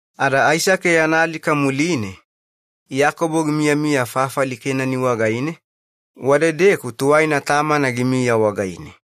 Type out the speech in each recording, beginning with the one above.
Ada Aisake yana alika muline, Iyakobo gimiyamiya fafali Kenani wagaine, wadedeku tuwaina tamana gimiya wagaine.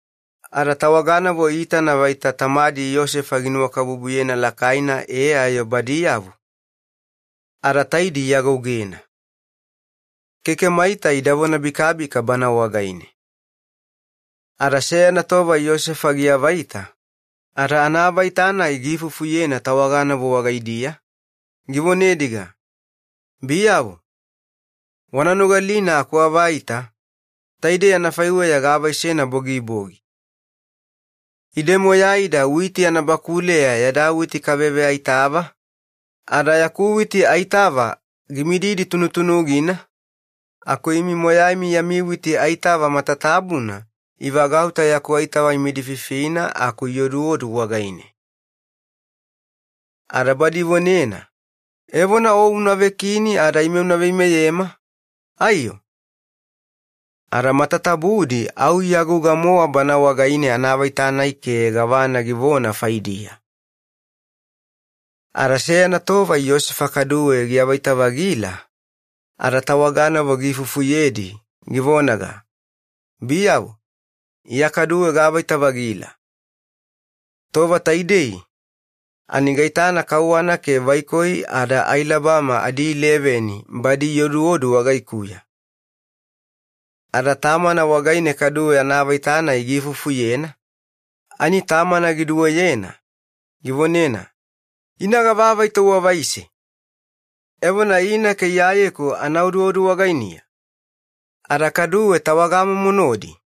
Ada tawaganavo iitana vaita tamadi Yosefa ginuwakabubuyena lakaina ada badiyavo ani taidi iagougena. Keke maita ida vonabikabika wagaine. Ada seyana tova Yosefa giavaita, ada anaavaita-nai giifufuyena tawaganavo wagaidiya, givonediga, “Biyavo, wana nogalina akuavaita, taidei anafaiweya gaavaisena bogibogi. Ide moyaida witi anabakuleya yada witi kaveveaitava, ada yaku witi aitava gimididi tunutunugina aku imi moyaimi yami witi aitava matatabuna ivagauta yaku aitava imidififina aku ioduodu wagaine.” Ada badi ivonena, “Evona o unavekini ada ime una veimeyema aiyo?” Ada matatabudi au iagouga-mowa banae wagaine anaavaita-nai ke gavana givona faidiya. Ada seyana tova Yosefa kaduwe giavaita-vagila, ada tawaganavo giifufuyedi, givonaga, “Biyavo, iya kaduwe gaavaita-vagila. Tova taidei ani gaitana kauwana ke vaikoi ada ailabama adileveni badi ioduodu wagaikuya.” Ada tamana wagaine kaduwe anaavaita-nai giifufuyena, ani tamana giduweyena, givonena, “Ina gava avaita uavaise? Evona ina ke iyayeku ana oduodu wagainiya? Ada kaduwe tawagamomo nodi?”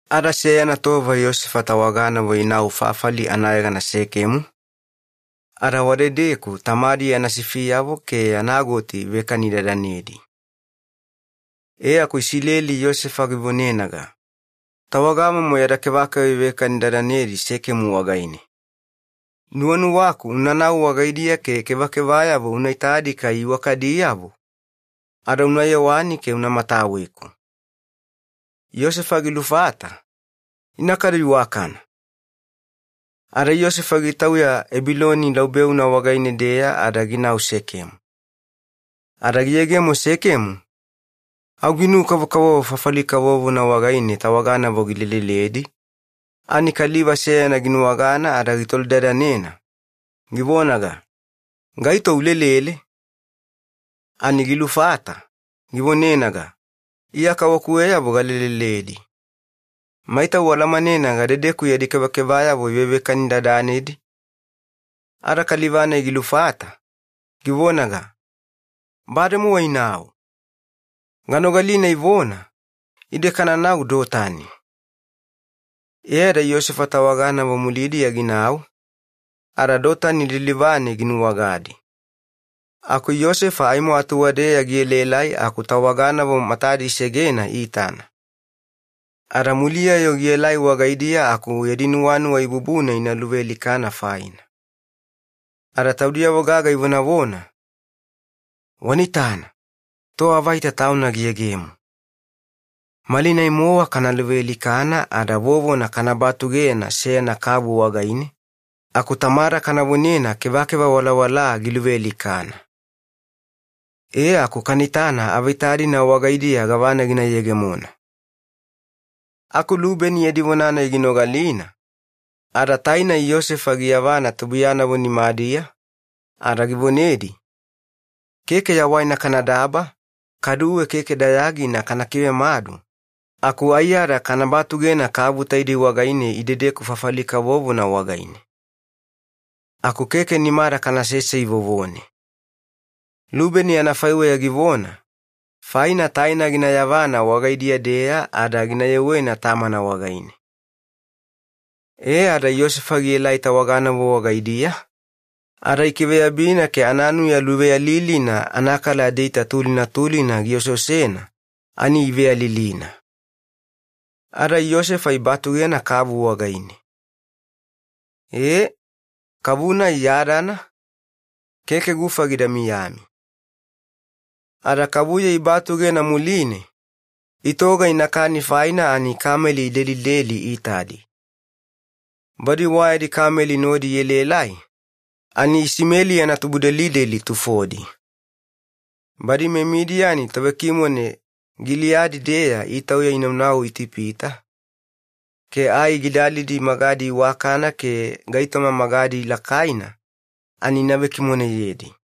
Ada seyana tova Yosefa tawaganavo inau fafali anayegana Sekemu ada wadedeku tamadi yana sifiyavo ke yana goti ivekanidadanedi. E aku Iyakobo Yosefa givonenaga, “Tawagamomo yada kevakeva ivekanidadanedi Sekemu wagaine. Nuwanuwaku unanau wagaidiya ke kevakevayavo una itadi kai iwakadiyavo ada una yewani ke una mataweku.” Yosefa gilufata, “Ina kadu iwakana.” Ada Yosefa gitauya Ebiloni laubeuna wagaine-deya ada ginau Sekemu. Ada giyegemo Sekemu au ginu-kavokavovo fafali kavovona wagaine tawaganavo gileleledi, ani kaliva seyana ginuwagana ada gitolidadanena, givonaga, “Gaito ulelele?” Ani gilufata, givonenaga, “Iya kawakuweyavo galeleledi. Maita ualamanena gadedeku yadi kevakevayavo ivevekanidadanedi?” Ada kaliva-nai gilufata, givonaga, “Bademowa inau. Ganogalina ivona, ‘Ide kananau Dotani.’” E ada Yosefa tawaganavo mulidiya ginau ada Dotani lilivane ginuwagadi. Aku Yosefa aimo atuwadeya gielaelai aku tawaganavo matadi isegena iitana. Ada muliya-yo gielai wagaidiya aku yadi nuwanuwa ibubuna ina luvealikana faina. Ada taudiyavo gaga ivonavona, “Wanaitana, toavaita tauna giyegemo! Malinai-mowa kana luvealikana ada vovona kana batugena seyana kavu wagaine aku tamada kana vonena kevakeva walawalaa giluvealikana. E aku kana itana avaita-dina wagaidiya gavana gina yegemona.” Aku Lubeni yadi vona-nai ginogalina ada gigaluvaluva ke taina Yosefa gina yavana tubuiyanavo nimadiya, ada givonedi, “Keke yawaina kanadaba kaduwe keke dayagina kana kivemadu, aku aiyada kana batugena kavu taidei wagaine idedeku makama kavovona wagaine. Aku keke nimada kanasesei vovone.” Lubeni anafaiweya givona faina taina gina yavana wagaidiya-deya ada gina yewena tamana wagaine. E ada Yosefa gielai tawaganavo wagaidiya ada ikiveyabina ke ananuya iwakana nimana manamanawena gioseosena ani iveyalilina. Ada Yosefa ibatugena kavu wagaine. E, kavu-nai yadana, keke gufa gida miyami. Ada kavuya ibatugena muline itoga ina kani faina ani kameli idelideli iitadi. Badi wayadi kameli nodi ielaelai ani Isimeli yana tubudelideli tufodi, badi meMidiyani tovekimone Giliyadi-deya itauya inauna Itipita ai gidalidi magadi iwakana ke gaitoma magadi lakaina ani ina vekimoneyedi.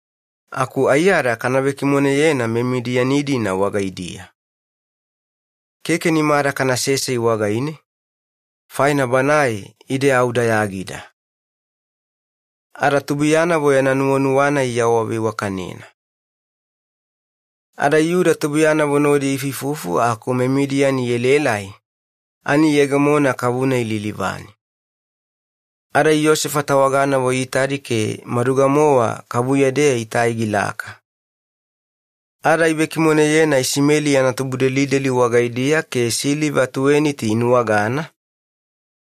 Aku aiyada kana vekimoneyena meMidiyani-dina wagaidiya, ada keke nimada kanasesei wagaine, faina banae ide au dayagida.” Ada tubuiyanavo yana nuwanuwa-nai iawaveiwakanena. Ada Yuda tubuiyanavo nodi iifuifufu aku meMidiyani ielaelai ani iyegemona kavu-nai lilivane. Ada Yosefa tawaganavo iitadi ke maduga-mowa kavuya-deya itai gilaka. Ada ivekimoneyena Isimeli yana tubudelideli wagaidiya ke siliva tuweniti inuwagana,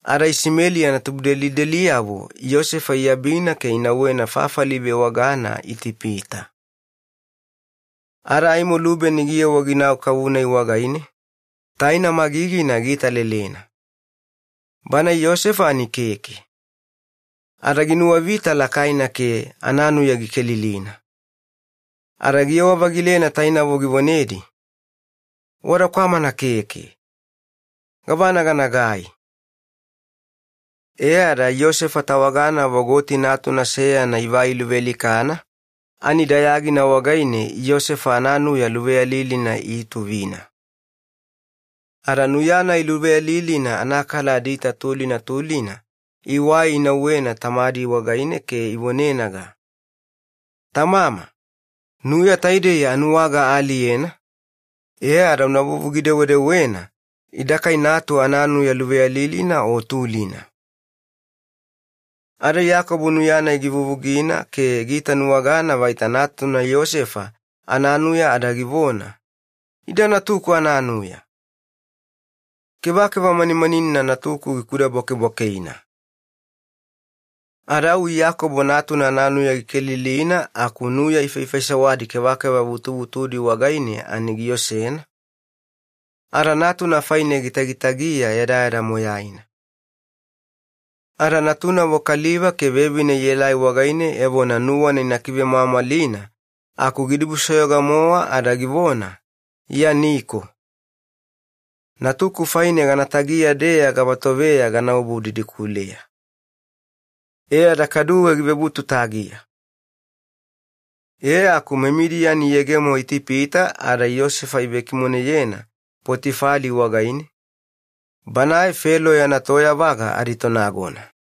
ada Isimeli yana tubudelideliyavo Yosefa iabina ke inauwena fafali ivewagana Itipita. Ada aimo Lubeni giyewa ginau kavu-nai wagaine, taina magigina giitalelena. Bana Yosefa ani keke. Ada aseasena giulolo ke ananuya gikelilina. Ada giyewa-vagilena tainavo givonedi, “Wada kwamana keke! Gavana ganagai?” E ada Yosefa tawaganavo goti natuna seyana ivai iluvealikana ani dayagina wagaine Yosefa ananuya iutuvina. Ada nuya-nai dayadayagina iwai inauwena tamadi wagaine ke ivonenaga, “Tamama, nuya taidei anuwaga aaliyena una vuvugi-dewedewena ida kai natu ananuya o tulina.” Ada Iyakobo nuya-nai givuvugina ke giitanuwagana vaita natuna Yosefa ananuya ada givona, “Ida natuku ananuya! Kevakeva manimaninina natuku gikudabwakebwakekeina!” Ada au Iyakobo tauna ananuya gikelilina aku nuya ifaifaisewadi kevakeva vutuvutudi wagaine ani giosena, ada natuna faine gitagitagiya yadayada moyaina. Ada natunavo kaliva ke vevine ielai wagaine evona nuwana ina kivemwamwalina aku gidibusoyoga-mowa ada givona, “Iya niko. Natuku faine gana tagiya-deya gava toveya ganaobu didikuleya.” E ada kaduwe givebutu tagiya. E aku meMidiyani iyegemo Itipita ada Yosefa ivekimoneyena Potifali wagaine, banae Felo yana toyavaga aditonagona.